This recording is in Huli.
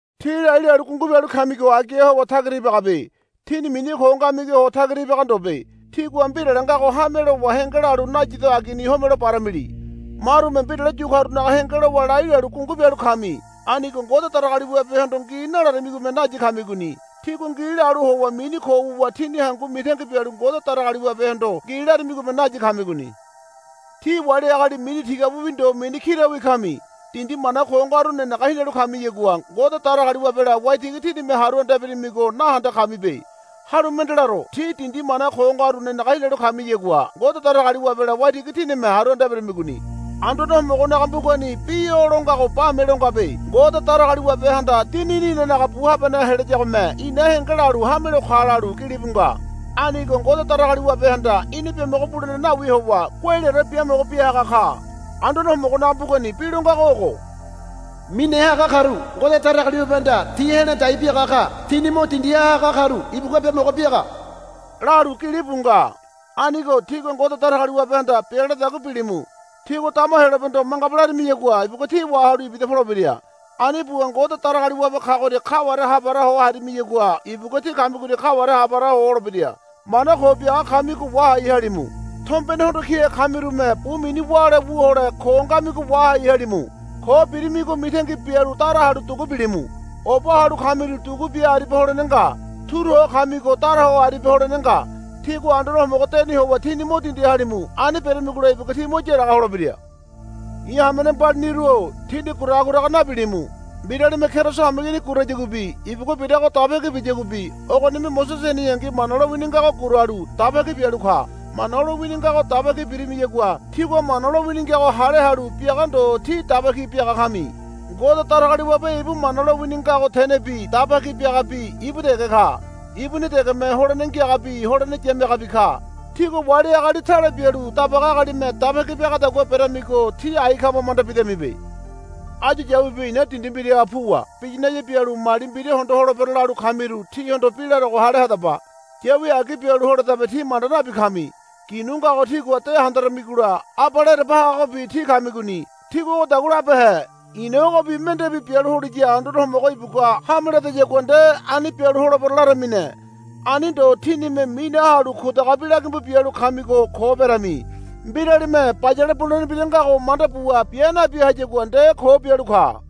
Tí lai lalu gungu bialu kamigo agiha howa tagira ibagabe. Tíni mini ko ngamigoha howa tagira ibaga ndobe. Tígua mbirale ngago hame lowa henge lalu nayido agini homelo baramili. Marume mbirale yu karunaga henge lowa lai lalu gungu bialu kami. Anigo Ngode Datagaliwabehondo ngi nalarimigome nayi kamigoni. Tígua ngi lalu howa mini ko wuwa tíni hangu mitangi bialu Ngode Datagaliwabehondo ngi larimigome nayi kamigoni. Tí wali agali mini tigabiwi ndo mini kirawi kami. Dindi mana ko ngaru nenege hinalu kamiyagua Ngode Datagaliwabela waitigi tínime haru anda eberamigo nahende kamibe. Halu mende laro. Tí dindi mana ko ngaru nenege hinalu kamiyagua Ngode Datagaliwabela waitigi tínime haru anda eberamigoni. Anduane Homogonaga mbugani bi o lo ngago bame lo ngabe, Ngode Datagaliwabehanda dinini inanaga bu habaneha helayagome ina henge lalu hamelo ka, lalu gilibu nga. Anigo Ngode Datagaliwabehanda ina biamogo bulene nawi howa guaileore biamogo biahaga ka. Anduane Homogonaga mbugani bi lo ngago ogo, Mine haga karu Ngode Datagaliwabehanda ti he̱la dai biaga ka. Tini mo dindiha haga karu ibugua biamogo biaga, lalu gilibu nga. Anigo tígua Ngode Datagaliwabehanda bia laradagua bilimu. Tígua dama Heyolabehondo, Mangaba, larimiyagua ibugua tí wahalu ibida polebira. Ani buwa Ngode Datagaliwabe kagoria kaware hapara ho harimiyagua ibugua tí kamigoria kaware hapara ho holebira. Mana ko biaga kamigo wahai halimu. Tombene hondo kihe kamirume bu mini wále wu hole ko ngamigo wahai halimu. Ko birimigo mitangi bialu dara halu dugu bilimu. Oba halu kamiru dugu bia aribia holene nga. Turu ho kamigo dara ho aribia holene nga. Tígua Anduane Homogo deni howa tíni mo dindi halimu. Ani beramigola ibugua tí mo yaraga holebira. I̱ hamene mbaliniru-o tíni guraga guraga nabilimu. Mbiralime Keriso hameigini gurayaguabi ibugua birago daba ki biyaguabi ogonime Mosese heneyangi Mana lowini ngago guralu daba ki bialu ka. Mana lowini ngago daba ki birimiyagua tígua Mana lowini ngago hale halu biaga ndo tí daba ki biaga kami. Ngode Datagaliwabe ibu mana lowini ngago tenebi daba ki biagabi ibu dege ka. Ibuni degeme holene ngiagabi holene yamiagabi ka. Tígua wali agali tale bialu dabaga agalime daba ki biagadagua beramigo tí ai kama manda bidamibe. Áyu yawibi i̱na dindi mbiraha puwa biyinaya bialu mali mbira hondo holebero, lalu kamiru tíhondo bi larogo hale hadaba. Yawi agi bialu holedabe tí manda nabi kami. Ginu ngago tígua de handaramigola abale ereba hagagobi tí kamigoni. Tígua ogodagua labehe. I̱na ogobi mendebi bialu holiya Anduane Homogo ibugua hame ledayagua nde ani bialu holebero, laramine. Ani ndo tínime mine halu kudaga bi lagimbu bialu kamigo ko berami. Mbiralime bayale bulene mbira ngago manda buwa bia nabi hayagua nde ko bialu ka.